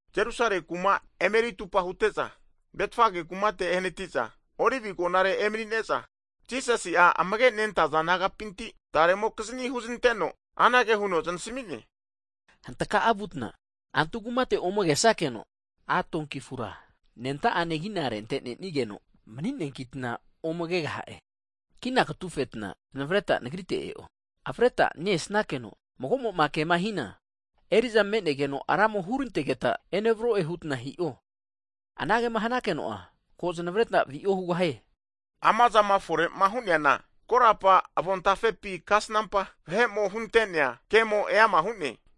Jerusale kuma emeri tupa hute'za Betfage kumate ehnati'za, Olivi agonare emanine'za, Jisasi'a amage nentaza disaipol nagapinti tare'mokizni huznanteno, anage huno znasmi'ne, hantka'a vutna antu kumate ome kesakeno, a' donki afura, anenta'ane kina rentenenigeno mni'neakitna ome kegaha'e. Kina katufetna znavreta Nagrite e'o. Avreta ne-esnakeno mago'moma kema hina, eri'za me'negeno Ramo hurantegeta enevro'e hutna hi'o. Anagema hanankeno'a, ko avretna vi'o hugahie. Amazama fore hu'neana korapa avontafepi kasnampa vahe'mo hunte'nea, kemo eama hu'ne.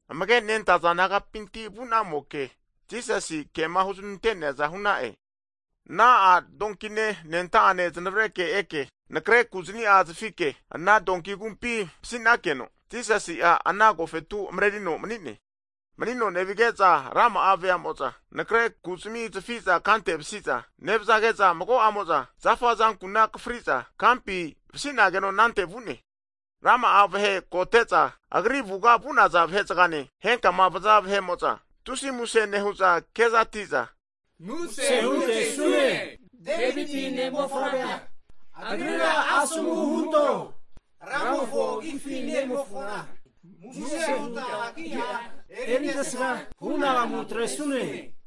Amage nenta'za disaipol nagapinti vu'namoke Jisasi kema huznante'neaza hu'na'e. Ana a' donkine, anenta'ane znavre'ne eke anakre kuzni'a zafike ana donki agumpi vasi'nakeno, Jisasi'a ana agofetu mrerino mani'ne. Manino nevige'za rama'a veamo'za anakre ku'zmi zafiza kante vasi'za nevzage'za, mago'amo'za zafa azankuna akafri'za kampi vasinageno anante vu'ne. Rama'a vahe kote'za Agri avuga vu'naza vahe'zgane, henkama aza vahe'mo'za tusi muse nehu'za kezati'za, muse huntesune Deviti ne'mofavrea, agrira asomu hunto ramofo agifi ne-emofona, muse huta agi'a erintesga hunagamu atresune.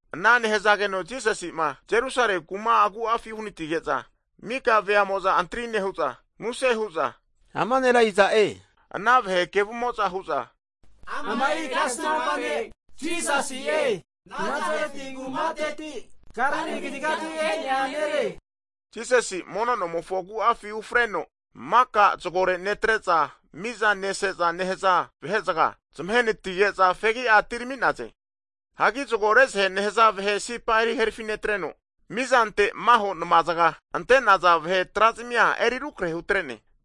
Ana nehzageno Jisasi'ma, Jerusale kuma agu'afi uhnatige'za mika veamo'za antri nehu'za muse hu'za, Ama nera iza'e? Ana vahe kevumo'za hu'za, Ama'i kasnampa ne' Jisasi'e, Nasareti kumateti, Galili kazigati e'nea nere. Jisasi'a mono nomofo agu'afi ufreno maka zgore netre'za miza neseza nehza vahe'zga zmahe anatige'za fegi'a atirami'naze. Hagi zgo rezahe nehza vahe sipa eri herafi netreno, mizante maho nma zga ante'naza vahe tra'zmi eri rukrahe hutre'ne.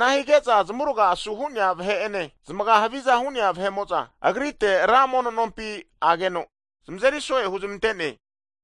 Ana hige'za zmuraga asu hu'nea vahe'ene, zmaga haviza hu'nea vahe'mo'za Agrite ra mono nompi ageno zmazeri so'e huzmante'ne.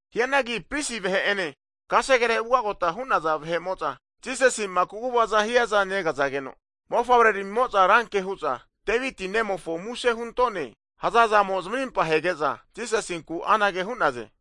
Hianagi pris vahe'ene kasegere ugagota hu'naza vahe'mo'za Jisasi'ma kaguvaza hiaza negazageno, mofavre ramimo'za ranke hu'za, Deviti Nemofo muse huntone hazazamo zamarimpa hege'za, Jisasinku anage hu'naze,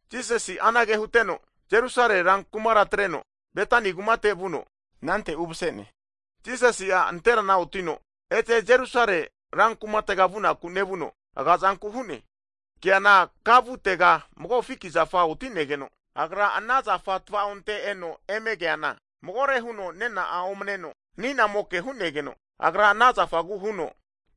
Jisasi anage huteno Jerusale rankumara atreno Betani kumate vuno, anante umse'ne. Jisasi'a nanterana otino ete Jerusale rankumatega vunaku nevuno aga'zanku hu'ne. Keana ka vutega magoke fiki zafa oti'negeno, Agra ana zafa tava'onte eno eme keana magore huno nena'a omneno ani'namoke hu'negeno, Agra ana zafagu huno,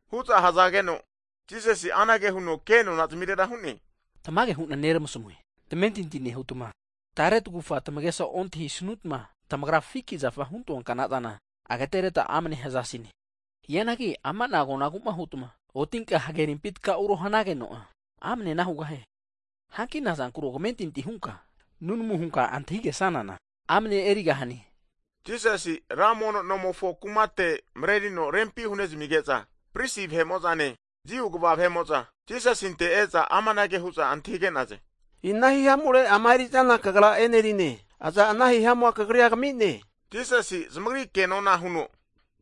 Hu'za hzageno, Jisasi'a anage huno kenona zmirera hu'ne, Tamage hu'na neramasmue, tamentinti nehutma tare tagufa tamagesa ontahisnutma, tamagra fiki zafa huntoa kna'zana ageteretma amne hzasine. Hianagi ama'na agonagu hutma, otinka hage rimpi tka'uro hanageno'a amne ana hugahie. Hanki nazankuro kamentinti hunka, nunamu hunka antahigesanana, amne erigahane. Jisasi'a ra mono nomofo kumate mrerino rempi hu'nezmige'za, pris vahemo'zane, Jiu kva vahe'mo'za Jisasinte e'za amanage hu'za antahige'naze, Ina hihamure ama eri'zana Kagra e'nerine, Aza ana hihamua Kagrira kami'ne? Jisasi zamagri kenona huno,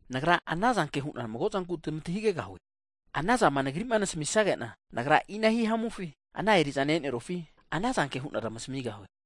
Nagra anazanke hu'na mago zanku tmantahigegahue, anazama Nagri'ma nasmisage'na, Nagra ina hihamufi ana eri'zana e'nerufi anazanke hu'na tmasmigahue.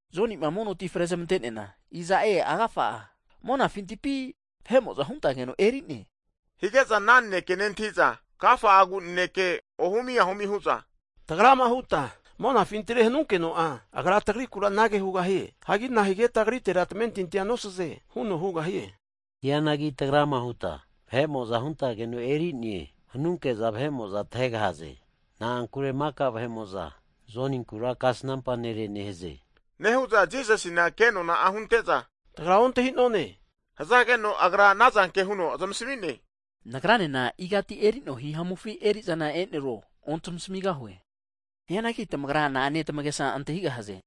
Joni'ma mono ti frezmante'neana, iza'e agafa'a, monafintipi vahe'mo'za huntageno eri'ne? Hige'za ana vahe'mo'za nanekea nentahi'za agafa'agu naneke ohumi ahumi hu'za, tagrama huta, monafintire hanunkeno'a, Agra tagriku anage hugahie, hanki nahigetma agritera tamentintina nosaze? Huno hugahie. Hianagi tagrama hutma, vahe'mo'za huntageno eri'ne hanunke'za, vahe'mo'za tahegahaze hu'za koro hu'naze. Na'ankure maka vahe'mo'za Joninkura kasnampa nere nehaze. Nehu'za Jisasina ke nona'a hunte'za, Tagra ontahi'none hzageno, Agra anazanke huno zmasmi'ne, Nagranena igati eri'noa hihamufi eri'zana eneruo ontamasmigahue. Hianagi tamagra na'ane tamagesa antahigahaze?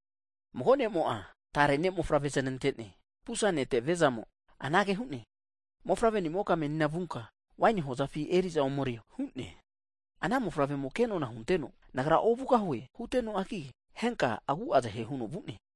Mago ne'mo'a tare ne'mofavre znante'ne. Pusa ne'te viazamo anage hu'ne, mofavre'nimoka menina vunka waini hozafi eri'za omerio hu'ne. Ana mofavremo'a ke nona hunteno, Nagra ovugahue hutenoagi, henka agu'a zahe huno vu'ne.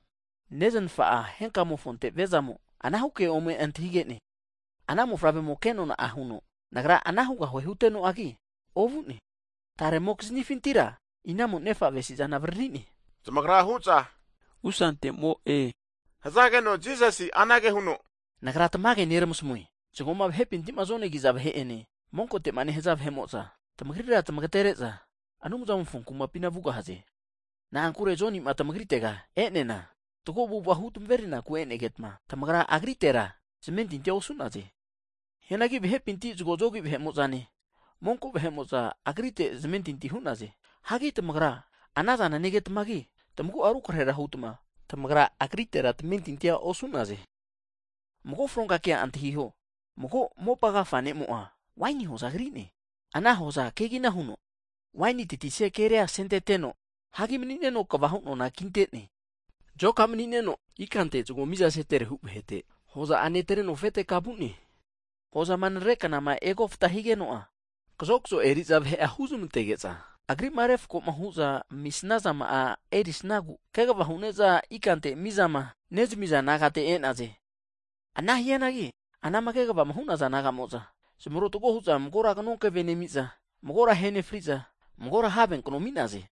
Neznafa'a henka'mofonte viazamo anahu ke huno ome antahige'ne. Ana mofavremo ke nona huno, nagra ana hugahue hutenoagi, ovu'ne. Taremokiznifintira inamo nefa avesizana avaririne? Zamagra hu'za Pusante'mo'e, hzageno Jisasi anage huno, Nagra tamage neramasmue, zgoma vahepinti zonegiza vahe'ene, monkote'ma nehaza vahe'mo'za tmagrira tmagatere'za Anumzamofo kumapina vugahaze. Na'ankure Jonima tmagritega e'neana fatgo avu'ava huramerinaku e'negetma, tamagra agritera tamentinti osu'naze. Hianagi, vahepinti zgo zogi vahe'mo'zane, monko vahe'mo'za agritera zmentinti hu'naze. Hagi tamagra ma ana zana negetmagi, tamagu'a rukrahe hutma tamentinti huonte'naze. Mago fronka kea antahiho. Mago mopa agafa ne'mo'a waini hoza kri'ne. Ana hoza kegina huno wainima tatisia keria asenteteno, hagi mni'neno kvahu nona kintene. Zoka mni'neno ikante zgo mizaseterehu (rent) vahete hoza'a netreno afete ka vu'ne. Hozama anarere knama egoftama higeno'a, kazokzo eri'za vahe'a huzmantege'za, agri'ma refako hu'za amisnazama'a erisnagu kegva hu'ne'za ikante mizama (rent) nezamiza nagate e'naze. Ana hianagi, anama kegvama hu'naza nagamo'za zmarotago hu'za, magora knonkeve nemi'za, magora ahe nefri'za, magora have kanonu ahe'naze.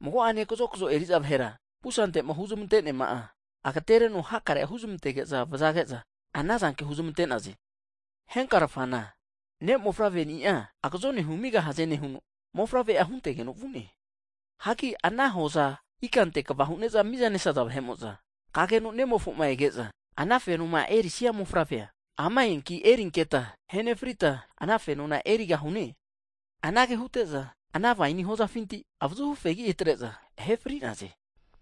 Mago'ane kazokzo eri'za vahera pusante'ma huzmante'neama'a agatereno hakare huzmantege'za vazage'za, anazanke huzmante'naze. Henkarfana, ne' mofavreni'a agazone humigahaze nehuno mofavre'a huntegeno vu'ne. Hagi ana hoza ikante kva hu'ne'za miza nesaza vahe'mo'za, kageno nemofo'ma ege'za, ama fenoma erisia mofavre ama eanki erinketa ahenefrita ana fenona erigahune. Anage hute'za, ana waini hozafinti avazuhu fegu atre'za ahe fri'naze.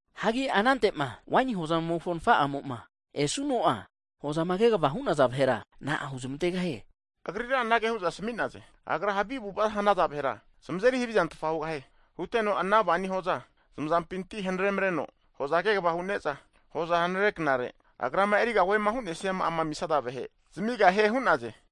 Hagi anantema waini hozamofo nfa'amo'ma esuno'a, hozama kegvama hu'naza vahera, na'a huzmantegahie? Agrira anage hu'za asmi'naze, Agra havi avu'ava hanaza vahera zmazeri havizahutfa hugahie. Huteno ana waeni hoza zmazampinti hanare'mreno, hoza kegva hu'ne'za hoza anerere knare, agrama erigahue hu'nesiama'ama amisaza vahe zamigahie hu'naze.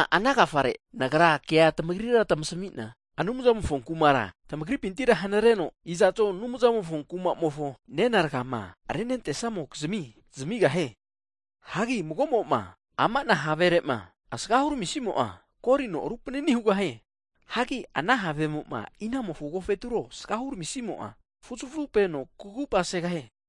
Ama ana agafare, Nagra kea tmagrira tamasmina, Anumzamofo kumara tmagripintira hanareno, iza'zo Anumzamofo kuma'mofo nena rgama renentesnamokizmi zamigahie. Hagi mago'mo'ma amana havere'ma asaga hurmisimo'a, korino rupanini hugahie. Hianagi ana havemo'ma inamofo agofeturo asagahu ramisimo'a fuzafupeno kugupa segahie.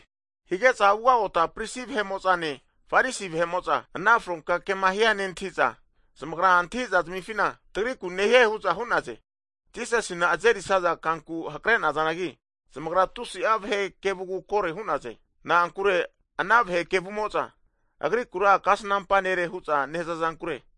Hige'za ugagota prisi vahe'mo'zane, Farisi vahe'mo'za ana fronka kema hia nentahiza, zamagra antahi'za zmifina, tagriku nehie hu'za hu'naze. Jisasina azerisaza kanku hakre'nazanagi, zamagra tusi'a vahe kevugu kore hu'naze. Na'ankure ana vahe kevumo'za, Agrikura kasnampa nere hu'za nehza'zankure.